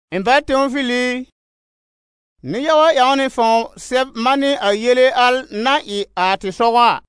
Ɩ̃ bá Teofil i, nɩ-yaga ƴãw nɩ fãw sɛb manɩ a yele al na ɩ a tɩ sɔgɔ a.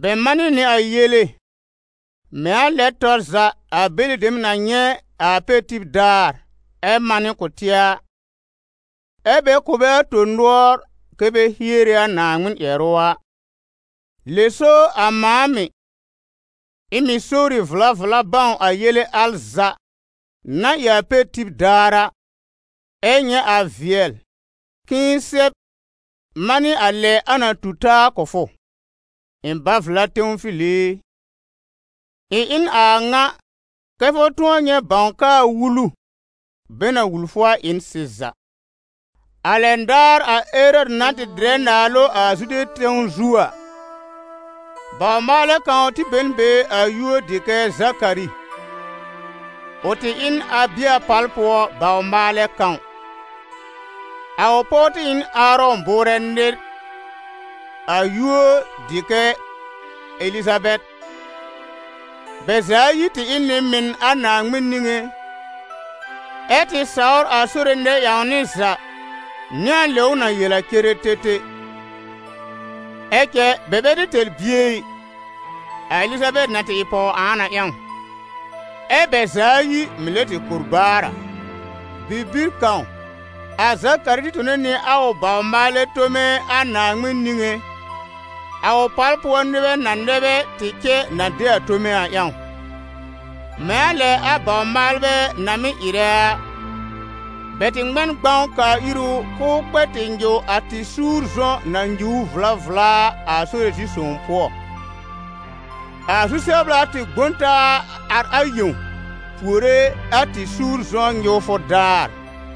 Bɛ manɩ nɩ a yele, mɛ̃ a lɛ tɔr za a bɛlɩ dem na nyɛ̃ a a pɛr tib daar ɛ manɩ kʋ̀ tɩ a, ɛ́ bɛ kʋ̀ bɛ a tõ-nʋɔr kɛ bɛ hiere a Naaŋmɩn ƴɛrʋ a. Lɛ so a mãa mɩ̀, ɩ̃ mɩ̀ sowri vla vla bãw a yele al za na ɩ a pɛr tib daar a, ɛ nyɛ̃ a vɩɛl k'ɩ̃ɩ sɛb manɩ a lɛ a na tu taa kʋ̀ fʋ, ɩ̃ bá-vla Teofil i. Ɩ̃ ɩ n a ŋa kɛ fʋ tʋ̃ɔ nyɛ̃ bãw k'aa wulu, bɛ na wul fʋ a, ɩ n sɩza. A lɛn daar a Erɔdɩ na tɩ dɩrɛ naalʋ a Zude tẽw zu a, bawr-maalɛ kãw tɩ be n be a yúor dɩ kɛ Zakari; ʋ tɩ ɩ n Abɩa pal pʋɔ bawr-maalɛ kãw. A ʋ pɔw tɩ ɩ n Aarɔ̃ bʋʋrɛ nɩr, a yúor dɩ kɛ Elizabɛr. Bɛ za ayi tɩ ɩ n nɩ-mɩn a Naaŋmɩn niŋé ɛ tɩ sawr a Sore nɛ-ƴãwnɩ za, nɩ a lɛ ʋ na yel a ceretete. Ɛ cɛ bɛ bɛ tɩ tɛr bie ɛ, a Elizabɛr na tɩ ɩ pɔw-ãan a ƴãw, ɛ bɛ za ayi mɩ̀ lɛ tɩ kor baar a. Bibir kãw, a Zakari tɩ tone nɩ a ʋ bawr-maalɛ tome a Naaŋmɩn niŋé, a ʋ pal pʋɔ nɩbɛ na nɛ bɛ tɩ cɛ na de a tome a ƴãw. Mɛ̃ a lɛ a bawr-maalbɛ na mɩ́ ɩrɛ a, bɛ tɩ ŋmɛ n gbãw kaa ir ʋ k'ʋʋ kpɛ tɩ nyɩw a tɩ-suur-zɔ̃ na nyuur vla vla a, a Sore zi-sõw pʋɔ. A zu-sɛbla tɩ gbõ n taa ar a yẽw puore a tɩ-suur-zɔ̃ nyɩwfʋ daar.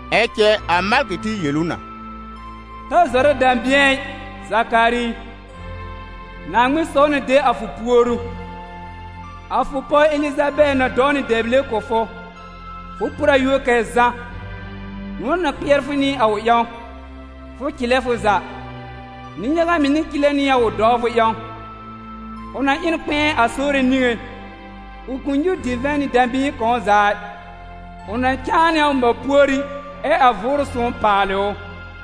Ɛ cɛ a malkɩ tɩ yel ʋ na: «Ta zɔrɛ dɛ̃bɩ̃ɛ ɩ, Zakari i, Naaŋmɩn saw na de a fʋ puoru. A fʋ pɔw Elizabɛr na dɔw nɩ bi-dɛble kʋ̀ fʋ, fʋ por a yúor kɛ Zã. Nʋ̃ɔ̀ na kpɩɛr fʋ nɩ a ʋ ƴãw, fʋ cɩlɛ fʋ za; nɩ-yaga mɩ̀ na cɩlɛ nɩ a ʋ dɔwfʋ ƴãw. Ʋ na ɩ n kpɛ̃ɛ a Sore niŋé, ʋ kʋ̃ nyúur divɛ̃ nɩ dã-bɩ̃ɩ kãw za ɩ; ʋ na cãa nɩ a ʋ mã púorí ɛ a Vʋʋrʋ Sõw paalɩ ʋ.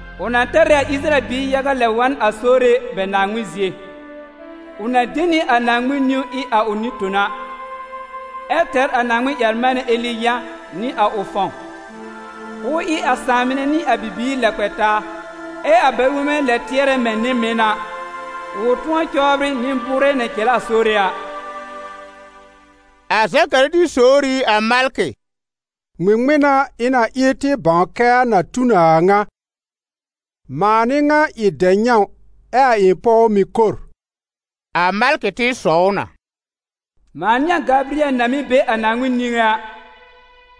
Ʋ na tɛr ɩ a Ɩsɩrayɛl biir yaga lɛb wa n a Sore bɛ Naaŋmɩn zie; ʋ na de nɩ a Naaŋmɩn niwn ɩ a ʋ nɩ-tona, ɛ tɛr a Naaŋmɩn-ƴɛr-manɛ Eli yã nɩ a ʋ fãw, k'ʋʋ ɩ a sãà mɩnɛ nɩ a bibiir lɛ kpɛ taa, ɛ a bɛ-wonbɛ lɛ tɩɛrɛ mɛ̃ a nɩ-mɩn a, ʋ tʋ̃ɔ cɔbrɩ nɩ-bʋʋrɛ na cɛlɛ a Sore a.» A Zakari tɩ sowr ɩ a malkɩ: «Ŋmɩŋmɩn n'a ɩ̃ na ɩ tɩ bãw kɛ a na tu n a a ŋa? Mãa n'ɩ ŋa ɩ dɛ-nyãw ɛ a ɩ̃ pɔw mɩ̀ kor.» A malkɩ tɩ sɔw ʋ na: «Mãa n'ɩ a Gabɩyɛl na mɩ́ be a Naaŋmɩn niŋé a;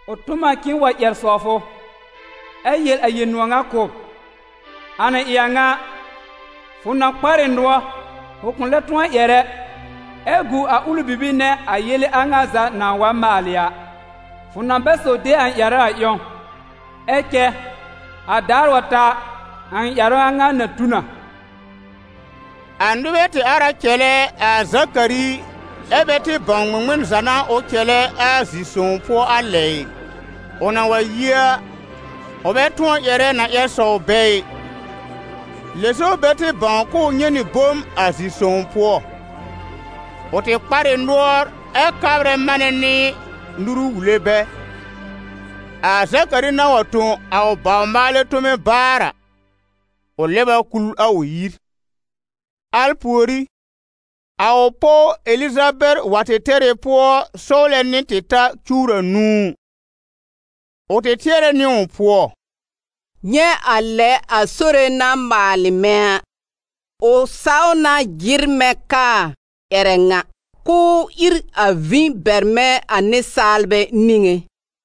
ʋ tõ m a k'ɩ̃ɩ wa ƴɛr sɔw fʋ, ɛ yel a yel-nʋ̃ɔ̀ ŋa kʋ̀ b. A na ɩ a ŋa a, fʋ na kpar ɩ nʋɔr, fʋ kʋ̃ lɛ tʋ̃ɔ ƴɛr ɛ, ɛ gu a ʋlɩ bibir nɛ a yele a ŋa za nãa wa maalɩ a, fʋ na bɛ saw de a ɩ̃ ƴɛrʋ a ƴãw, ɛ cɛ a daar wa ta a, a ɩ̃ ƴɛrʋ a ŋa na tu na.» A nɩbɛ tɩ ar a cɛlɛ a Zakari, ɛ́ bɛ tɩ bãw ŋmɩŋmɩn za n'a ʋ cɛlɛ a zi-sõw za pʋɔ a lɛ a ɩ. Ʋ na wa yi a, ʋ bɛ tʋɔr ƴɛrɛ na ƴɛr sɔw bɛ ɩ, lɛ so bɛ tɩ bãw k'ʋʋ nyɛ̃ nɩ bom a zi-sõw pʋɔ; ʋ tɩ kpar ɩ nʋɔr ɛ kabrɛ manɛ nɩ a nuru wule bɛ. A Zakari na wa tõ a ʋ bawr-maalɛ tome baar a, ʋ lɛb a kul a ʋ yir. Al pùorí, a ʋ pɔw Elizabɛr wa tɩ tɛr ɩ pʋɔ sɔwlɛ nɩ tɩ ta cuwr anũu. Ʋ tɩ tɩɛrɛ nɩ ʋ pʋɔ: «Nyɛ̃ a lɛ a Sore na maalɩ mɛ̃ a, ʋ saw na jɩr mɛ̃ kaa ƴɛrɛ ŋa, k'ʋʋ ír a vĩ bɛr mɛ̃ a nɩsaalbɛ niŋé.»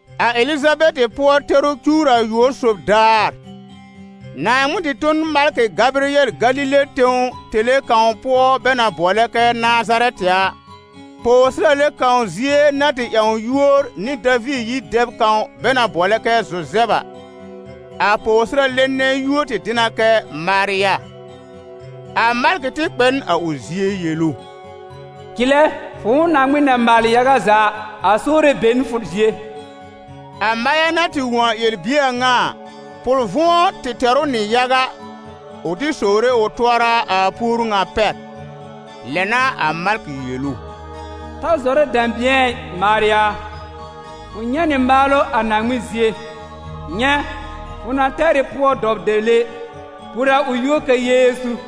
A Elizabɛr pʋɔ-tɛrʋ cuwr ayʋɔb sob daar, Naaŋmɩn tɩ tõ n a malkɩ Gabɩyɛl, Galile tẽw, tẽle kãw pʋɔ bɛ na bʋɔlɛ kɛ Nazarɛtɩ a, pɔwsɩrale kãw zie na tɩ ƴãw yúor nɩ Daviir yir dɛb kãw bɛ na bʋɔlɛ kɛ Zuzɛb a: a pɔwsɩrale nɛ yúor tɩ dɩ na kɛ Marya. A malkɩ tɩ kpɛ n a ʋ zie yel ʋ: «Cɩlɛ, fʋ̃ʋ Naaŋmɩn na maalɩ yaga za a, a Sore be n fʋ zie.» A Marya na tɩ wõ a ƴɛr-bie a ŋa a, pʋl-vʋ̃ɔ tɩ tɛr ʋ nɩ yaga, ʋ tɩ sowre ʋ tʋɔra a puoru ŋa pɛr. Lɛ n'a a malkɩ yel ʋ: «Ta zɔrɛ dɛ̃bɩ̃ɛ ɩ, Marya a, fʋ nyɛ̃ nɩ maalʋ a Naaŋmɩn zie. Nyɛ̃, fʋ na tɛr ɩ pʋɔ dɔw dɛble, por a ʋ yúor kɛ Yeezu.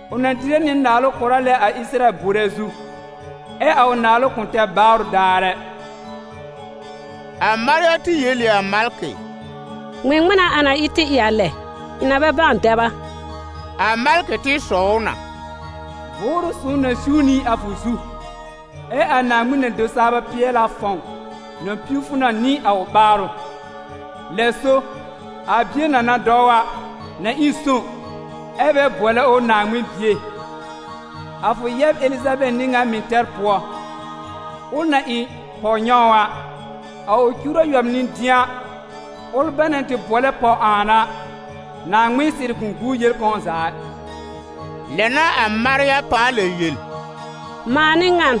ʋ na dɩrɛ nɩ naalʋ kʋra lɛ a Ɩsɩrayɛl bʋʋrɛ zu, ɛ a ʋ naalʋ kʋ̃ tɛr baarʋ daar ɛ.» A Marya tɩ yel ɩ a malkɩ: «Ŋmɩŋmɩn n'a a na ɩ tɩ ɩ a lɛ, Ɩ̃ na bɛ bãw dɛb a?» A malkɩ tɩ sɔw ʋ na: «Vʋʋrʋ Sõw na siw nɩ a fʋ zu, ɛ a Naaŋmɩn-na-do-saa-bɛ-pɩɛl-a fãw na piw fʋ na nɩ a ʋ ɓaarʋ; lɛ so a bie na na dɔw a, na ɩ sõw, ɛ́ bɛ bʋɔlɛ ʋ Naaŋmɩn Bie. A fʋ yɛb Elizabɛr n'ɩ ŋan mɩ̀ tɛr pʋɔ, ʋl na ɩ pɔw nyãw a, a ʋ cuwr ayʋɔb n'ɩ dɩ̃a, ʋl bɛ na tɩ bʋɔlɛ: pɔw-ãan a. Naaŋmɩn sɩrɩ kʋ̃ guu yel kãw za ɩ.» Lɛ n'a a Marya pãa lɛ yel: «Mãa n'ɩ ŋan,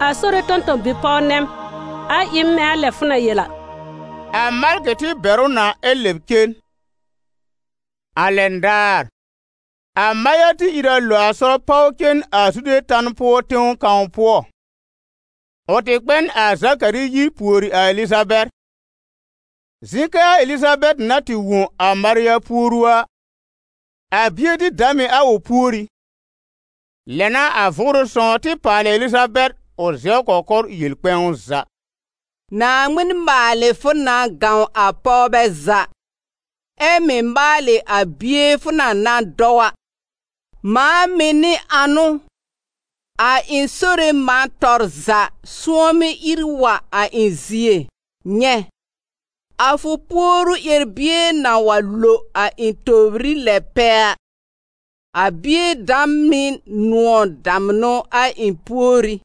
a Sore tõ-tõ-bi-pɔw nɛ m, a ɩ m mɛ̃ a lɛ fʋ na yel a.» A malkɩ tɩ bɛr ʋ na ɛ lɛb cen. A lɛn daar, a Marya tɩ ìr a lo a sɔr páw cen a Zude tan pʋɔ tẽw kãw pʋɔ. Ʋ tɩ kpɛ n a Zakari yir pùori a Elizabɛr. Zɩ̃ kɛ a Elizabɛr na tɩ wõ a Marya puoru a, a bie tɩ dam ɩ a ʋ púorí. Lɛ n'a a Vʋʋrʋ Sõw tɩ paalɩ a Elizabɛr, ʋ zɛw kɔkɔr yel kpɛ̃w za: «Naaŋmɩn maalɩ fʋ na gãw a pɔwbɛ za, ɛ mɩ̀ maalɩ a bie fʋ na na dɔw a. Mãa mɩ̀ n'ɩ ãnʋ, a ɩ̃ Sore mã tɔr za sʋ̃ɔmɩ ìr wa a ɩ̃ zie? Nyɛ̃, a fʋ puoru ƴɛr-bie na wa lo a ɩ̃ tòbrí lɛ pɛ a, a bie dam ɩ nʋ̃ɔ̀ damnʋ a ɩ̃ púorí.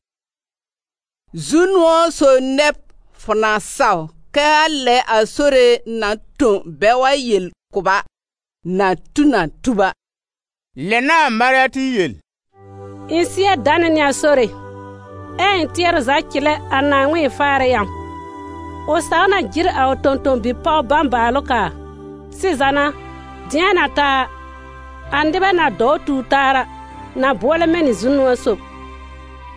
Zu-nʋ̃ɔ̀ sob nɛ b, fʋ na saw kɛ a lɛ a Sore na tõ bɛ wa yel kʋ̀ b a, na tu n a tub a.» Lɛ n'a a Marya tɩ yel: «Ɩ̃ sɩ́ɛ danɛ nɩ a Sore, ɛ a ɩ̃ tɩɛrʋ za cɩlɛ a Naaŋmɩn ɩ̃ faarɛ ƴãw. Ʋ saw na jɩr a ʋ tõ-tõ-bi-pɔw bãbaalʋ kaa. Sɩza n'a, dɩ̃a na ta a, a nɩbɛ na dɔwr tuur taa a, na bʋɔlɛ mɛ̃ nɩ Zu-nʋ̃ɔ̀ sob,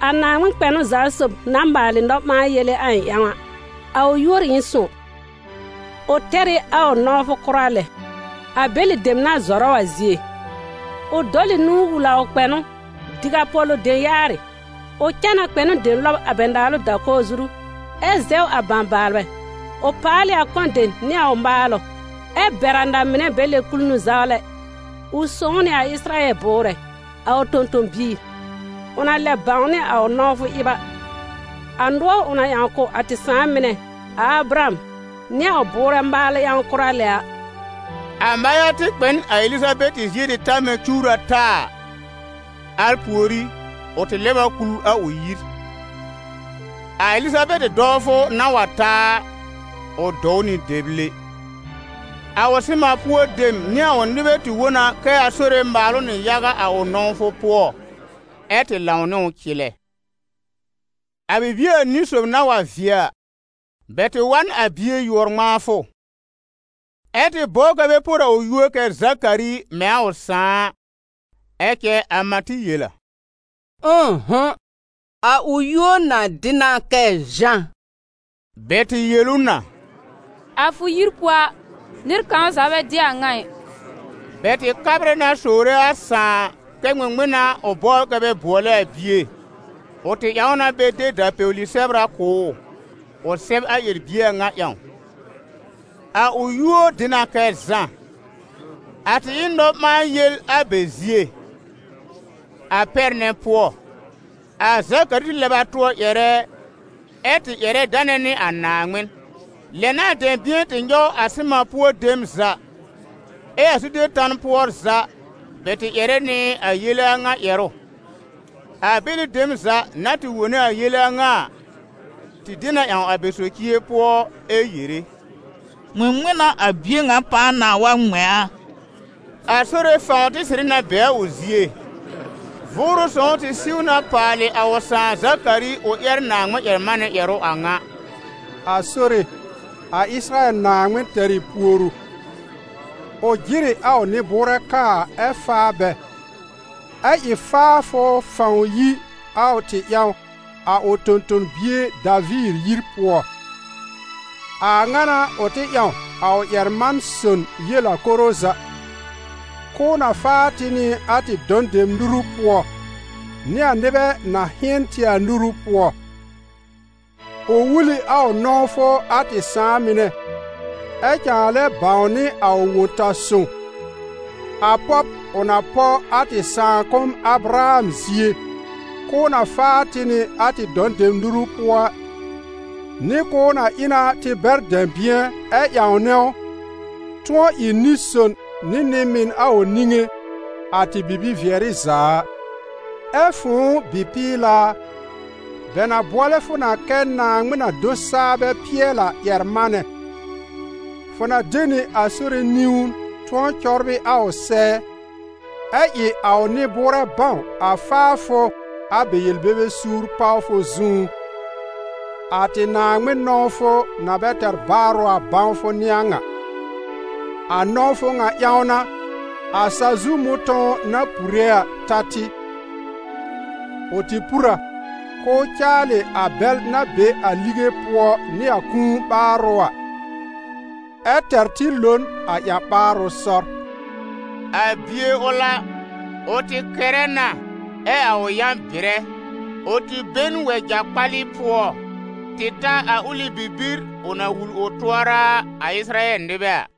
a Naaŋmɩn Kpɛnʋ-za-sob na maalɩ nɔ-ɓãa-yele a ɩ̃ ƴãw a. A ʋ yúor ɩ n sõw, ʋ tɛr ɩ a ʋ nɔ̃wfʋ kʋra lɛ a bɛlɩ dem na zɔrɛ ʋ a zie. Ʋ dɔl ɩ nũu wul a ʋ kpɛ̃nʋ: diw a pɔ̀lʋ dem yaarɩ; ʋ cã n a kpɛ̃nʋ dem lɔb a bɛ naalʋ da-kɔwr zuru, ɛ zɛw a bãbaalbɛ. Ʋ paal ɩ a kɔ̃ dem nɩ a ʋ maalʋ, ɛ bɛr a na-mɩnɛ bɛ lɛb kul nũ-zawlɛ. Ʋ sõw nɩ a Ɩsɩrayɛl bʋʋrɛ, a ʋ tõ-tõ-biir: ʋ na lɛb bãwnɩ a ʋ nɔ̃wfʋ ɩb a, a nʋɔr ʋ na ƴãw kʋ̀ a tɩ sãà mɩnɛ, a Abraham nɩ a ʋ bʋʋrɛ maalʋ ƴãw kʋra lɛ a.» A Marya tɩ kpɛ n a Elizabɛr zie tɩ ta mɛ̃ cuwr ata a, al pùorí, ʋ tɩ lɛb a kul a ʋ yir. A Elizabɛr dɔwfʋ na wa ta a, ʋ dɔw nɩ dɛble. A ʋ sɩman pʋɔ dem nɩ a ʋ nɩbɛ tɩ wõ na kɛ a Sore mal ʋ nɩ yaga a ʋ nɔ̃wfʋ pʋɔ, ɛ tɩ lãw nɩ ʋ cɩlɛ. A bibie anĩ sob na wa vɩɛ a, bɛ tɩ wa n a bie yʋɔr-ŋmãafʋ, ɛ tɩ bɔbr kɛ bɛ por a ʋ yúor kɛ Zakari mɛ̃ a ʋ sãà a. Ɛ cɛ a mã tɩ yel a: «Ʋ̃ʋ'hʋ̃! A ʋ yúor na dɩ na kɛ Zã.» Bɛ tɩ yel ʋ na: «A fʋ yir pʋɔ a, nɩr kãw za bɛ dɩ a a ŋa ɩ.» Bɛ tɩ kabrɛ na sowre a sãà kɛ ŋmɩŋmɩn n'a ʋ bɔbr kɛ bɛ bʋɔlɛ a bie. Ʋ tɩ ƴãw na bɛ de da-pɛwli-sɛbra kʋ̀ ʋ, ʋ sɛb a ƴɛr-bie a ŋa ƴãw: «A ʋ yúor dɩ na kɛ Zã.» A tɩ ɩ n nɔ-ɓãa-yel a bɛ zie. A pɛr nɛ pʋɔ, a Zakari tɩ lɛb a tʋɔr ƴɛrɛ, ɛ tɩ ƴɛrɛ danɛ nɩ a Naaŋmɩn. Lɛ n'a dɛ̃bɩ̃ɛ tɩ nyɔw a sɩman pʋɔ dem za, ɛ a Zude tan pʋɔ za, bɛ tɩ ƴɛrɛ nɩ a yele a ŋa ƴɛrʋ. A bɛlɩ dem za na tɩ wone a yele a ŋa a, tɩ de na ƴãw a bɛ socie pʋɔ, ɛ yere: «Ŋmɩŋmɩn n'a a bie ŋa pãa na wa ŋmɛ̃ a?» A Sore fãw tɩ sɩrɩ na be a ʋ zie. Vʋʋrʋ Sõw tɩ siw na paalɩ a ʋ sãà Zakari, ʋ ƴɛr Naaŋmɩn-ƴɛr-manɛ ƴɛrʋ a ŋa: «A Sore, a Ɩsɩrayɛl Naaŋmɩn tɛr ɩ puoru, ʋ jɩr ɩ a ʋ nɩ-bʋʋrɛ kaa ɛ faa bɛ, ɛ ɩ faafʋ fãw yi a tɩ ƴãw a ʋ tõ-tõ-bie Daviir yir pʋɔ. A a ŋa n'a ʋ tɩ ƴãw a ʋ ƴɛr-man-son yel a koro za, k'ʋʋ na faa tɩ nɩ a tɩ dɔ̃ dem nuru pʋɔ, nɩ a nɩbɛ na hɩ̃ɛn tɩ a nuru pʋɔ. Ʋ wul ɩ a ʋ nɔ̃wfʋ a tɩ sãà mɩnɛ, ɛ cãa lɛ bãwnɩ a ʋ Wõ-ta-sõw, a pɔb ʋ na pɔ a tɩ sãakʋm Abraham zie, k'ʋʋ na faa tɩ nɩ a tɩ dɔ̃ dem nuru pʋɔ a, nɩ k'ʋʋ na ɩ na tɩ bɛr dɛ̃bɩ̃ɛ ɛ ƴãwnɛ ʋ, tʋ̃ɔ ɩ nɩ-son nɩ nɩ-mɩn a ʋ niŋé, a tɩ bibi-vɩɛrɩ za a. Ɛ fʋ̃ʋ bɩ-pɩɩla a, bɛ na bʋɔlɛ fʋ na kɛ Naaŋmɩn-na-do-saa-bɛ-pɩɛl-a ƴɛr-manɛ, fʋ na de nɩ a Sore niwn tʋ̃ɔ cɔbrɩ a ʋ sɛɛ, ɛ ɩ a ʋ nɩ-bʋʋrɛ bãw a faafʋ a bɛ yel-bebe suur pawfʋ zũú, a tɩ Naaŋmɩn nɔ̃wfʋ na bɛ tɛr baarʋ a bãwfʋ n'ɩ a ŋa. A nɔ̃wfʋ ŋa ƴãw n'a, a sa-zu mʋ̃tɔ̃w na pure a ta tɩ. Ʋ tɩ pur a, k'ʋʋ caalɩ a bɛl na be a ligẽ pʋɔ nɩ a kũu ɓaárʋ́ a, ɛ tɛr tɩ lo n a ƴã-ɓaarʋ sɔr.» A bie ʋl a, ʋ tɩ kɛrɛ na ɛ a ʋ yã bɩrɛ; ʋ tɩ be n wɛja kpalɩ pʋɔ tɩ ta a ʋlɩ bibir ʋ na wul ʋ tʋɔra a Ɩsɩrayɛl nɩbɛ a.